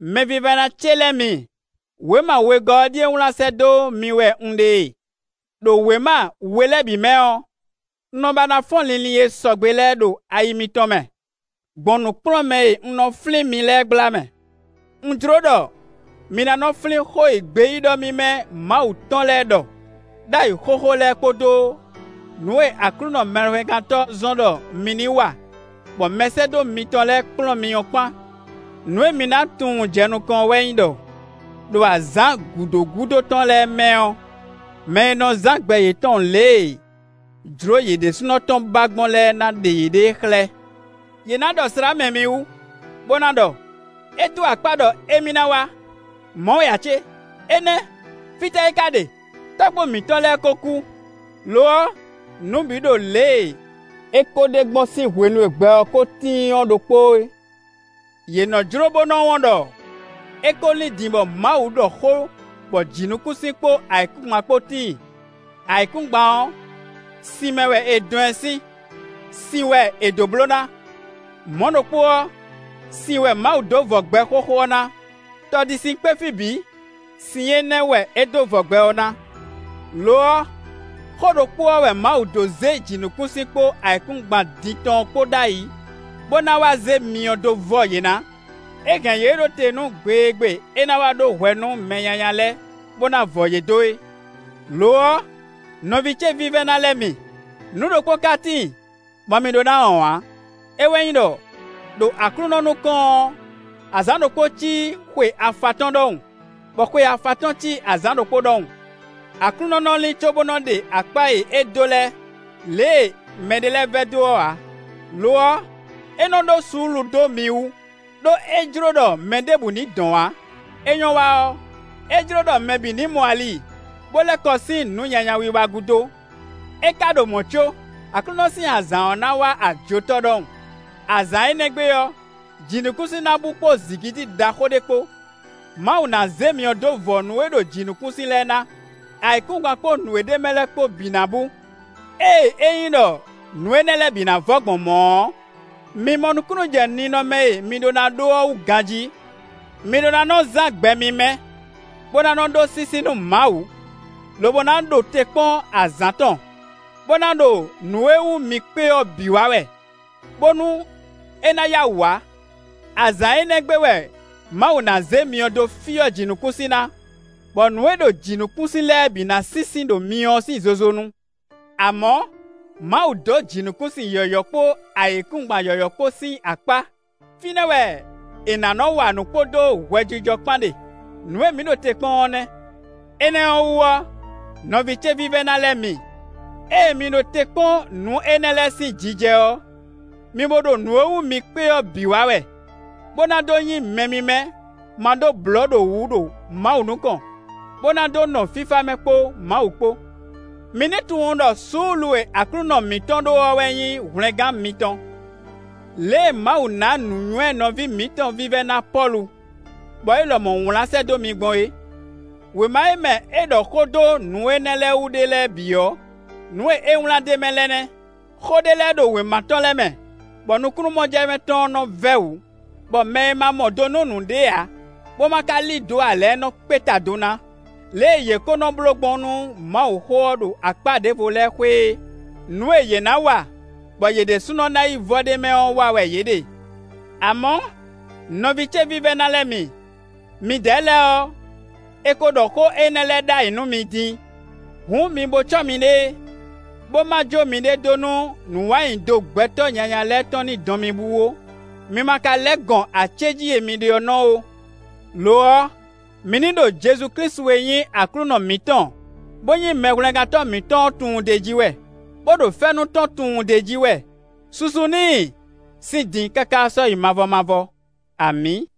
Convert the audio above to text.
Mɛvívɛ́ná ce lɛ́ɛ mi, wěma wegɔ́ ɔ́ ɖíe wlán sɛ́ dó mi wɛ un ɖe e. Đo wěma we lɛ́ɛ bǐ mɛ ɔ́, un nɔ ba ná fɔ́n linlin e sɔgbe lɛ́ɛ ɖo ayixa mitɔn mɛ, gbɔn nǔkplɔ́nmɛ e un nɔ flín mi lɛ́ɛ gbla mɛ. Un jló ɖɔ mi ná nɔ flín xó e gbeyíɖɔ mímɛ́ Mawu tɔn lɛ́ɛ ɖɔ ɖ'ayǐ xóxó lɛ́ɛ kpódó nǔ e Aklúnɔ Mɛhwlɛ́ngántɔ́ zɔ́n ɖɔ mi ní wa, bɔ mɛsɛ́dó mitɔn lɛ́ɛ kplɔ́n mi ɔ́ kpán. Nǔ e mi ná tunwun jɛ nukɔn ɔ́ wɛ nyí ɖɔ: ɖo azǎn gǔdo gúdo tɔn lɛ́ɛ mɛ ɔ́, mɛ e nɔ zán gbɛ yětɔn lě e jlǒ yě ɖésúnɔ tɔn ba gbɔn lɛ́ɛ ná ɖe yěɖée xlɛ́. Yě ná ɖɔ slǎmɛ mi wú, bó ná ɖɔ: “É dó akpá ɖɔ émí ná wá; mɔ̌ wɛ ǎ cé? Énɛ́! Fítɛ́ é ka ɖe? Tɔ́gbó mǐtɔn lɛ́ɛ ko kú; lo ɔ́, nǔ bǐ ɖo lě e é ko ɖe gbɔn sín hwenu e gbɛ ɔ́ ko tíin ɔ́ ɖokpóó é.” Yě nɔ jló bó nɔ wɔn ɖɔ é ko lín din bɔ Mawu ɖɔ xó bɔ jǐnukúnsin kpó ayǐkúngban kpó tíin. Ayǐkúngban ɔ́, sin mɛ wɛ è dɔn ɛ sín; sin wɛ é dó bló ná. Mɔ̌ ɖokpó ɔ́, sin wɛ Mawu dó vɔ gbɛ xóxó ɔ́ ná; tɔ ɖi sin kpé fí bǐ; sin énɛ́ wɛ é dó vɔ gbɛ ɔ́ ná. Lo ɔ́, xó ɖokpó ɔ́ wɛ Mawu dó zé jǐnukúnsin kpó ayǐkúngban din tɔn ɔ́ kpó ɖ'ayǐ, bó ná wá zé myɔ dó vɔ yě ná. É hɛn yě ɖó te nú gbe e gbe é ná wá ɖó hwɛ nú mɛ nyanya lɛ́ɛ, bó ná vɔ yě dó é. Lo ɔ́, nɔví ce vívɛ́ná lɛ́ɛ mi, nǔ ɖokpó ka tíin, bɔ mi ɖó ná wɔn ǎ: é wɛ nyí ɖɔ, ɖo Aklúnɔ nukɔn ɔ́, azǎn ɖokpó cí xwe afatɔ́n ɖɔhun, bɔ xwe afatɔ́n cí azǎn ɖokpó ɖɔhun. Aklúnɔ nɔ lín có bó nɔ ɖe akpá e é dó lɛ́ɛ, lě e mɛɖé lɛ́ɛ nɔ vɛdó ɔ́ ǎ. Lo ɔ́, é nɔ ɖó suúlu dó mi wú; ɖó é jló ɖɔ mɛ ɖěbǔ ní dɔn ǎ; é nyɔ́ wa ɔ́, é jló ɖɔ mɛ bǐ ní mɔ ali, bó lɛ́ kɔ sín nǔ nyanya wiwa gúdo. É ka ɖo mɔ̌ có, Aklúnɔ sín azǎn ɔ́ ná wá ajotɔ́ ɖɔhun. Azǎn énɛ́ gbe ɔ́, jǐnukúnsin ná bú kpó zǐngídi ɖaxó ɖé kpó; Mawu ná zé myɔ dó vɔ nǔ e ɖo jǐnukúnsin lɛ́ɛ ná; ayǐkúngban kpó nǔ e ɖ'é mɛ lɛ́ɛ kpó bǐ ná bú. Ée é nyí ɖɔ nǔ énɛ́ lɛ́ɛ bǐ ná vɔ gbɔn mɔ̌ ɔ́, mi mɔ nukúnnú jɛ ninɔmɛ e mi ɖó ná ɖó ɔ́ wú ganjí. Mi ɖó ná nɔ zán gbɛ mímɛ́, bó ná nɔ ɖó sísí nú Mawu, lobo ná ɖo te kpɔ́n azǎn tɔn, bó ná ɖo nǔ e wú mi kpé ɔ́ bǐ wa wɛ, bónú é ná yá wǔ wá. Azǎn énɛ́ gbe wɛ Mawu ná zé myɔ dó fyɔ́ jǐnukúnsin ná, bɔ nǔ e ɖo jǐnukúnsin lɛ́ɛ bǐ ná sínsín ɖo myɔ ɔ́ sín zozo nu. Amɔ̌, Mawu dó jǐnukúnsin yɔ̌yɔ́ kpó ayǐkúngban yɔ̌yɔ́ kpó sín akpá; fínɛ́ wɛ è nǎ nɔ wa nǔ kpódó hwɛjijɔ kpán ɖe; nǔ e mǐ ɖo te kpɔ́n ɔ́ nɛ́. Énɛ́ ɔ́ wú ɔ́, nɔví ce vívɛ́ná lɛ́ɛ mi, ée mi ɖo te kpɔ́n nǔ énɛ́ lɛ́ɛ sín jijɛ ɔ́, mi bo ɖo nǔ e wú mi kpé ɔ́ bǐ wa wɛ, bó ná dó nyí mɛ mímɛ́ ma ɖó blɔ̌ ɖo wǔ ɖo Mawu nukɔn, bó ná dó nɔ fífá mɛ kpó Mawu kpó. Mi ní tunwun ɖɔ suúlu e Aklúnɔ mǐtɔn ɖó ɔ́ wɛ nyí hwlɛngán mitɔn, lě e Mawu ná nǔnywɛ́ nɔví mǐtɔn vívɛ́ná Pɔ́lu, bɔ é lɔmɔ̌ wlán sɛ́ dó mi gbɔn é. Wěma e mɛ é ɖɔ xó dó nǔ énɛ́ lɛ́ɛ wú ɖe lɛ́ɛ bǐ ɔ́, nǔ e é wlán d'é mɛ lɛ́ɛ nɛ́. Xó ɖé lɛ́ɛ ɖo wěma tɔn lɛ́ɛ mɛ, bɔ nukúnnú-mɔjɛmɛ tɔn nɔ vɛ́ wǔ, bɔ mɛ e ma mɔ do nú nǔɖé ǎ, bó ma ka lí dǒ ǎ lɛ́ɛ nɔ kpé ta do ná, lě e yě ko nɔ bló gbɔn nú Mawuxó ɔ́ ɖo akpá ɖěvo lɛ́ɛ xwé é. Nǔ e yě ná wa, bɔ yě ɖésúnɔ ná yi vɔ ɖ'é mɛ ɔ́ wa wɛ yě ɖe. Amɔ̌, nɔví ce vívɛ́ná lɛ́ɛ mi, midɛɛ lɛ́ɛ ɔ́, è ko ɖɔ xó énɛ́ lɛ́ɛ ɖ'ayǐ nú mi din. Hǔn, mi bó cɔ́ miɖée, bó ma jó miɖée dó nú nǔ wa nyi do gbɛtɔ́ nyanya lɛ́ɛ tɔn ní dɔn mi bú ó; mi ma ka lɛ́ gɔn acéjí e mi ɖe ɔ́ nɔ ó. Lo ɔ́, mi ní ɖo Jezu Klísu e nyí Aklúnɔ mǐtɔn, bó nyí Mɛhwlɛ́ngántɔ́ mǐtɔn ɔ́ tunwun d'é jí wɛ, bó ɖo fɛ́nú tɔn tunwun d'é jí wɛ. Susu n'i sín din káká sɔ́yi mavɔ mavɔ. Amǐ.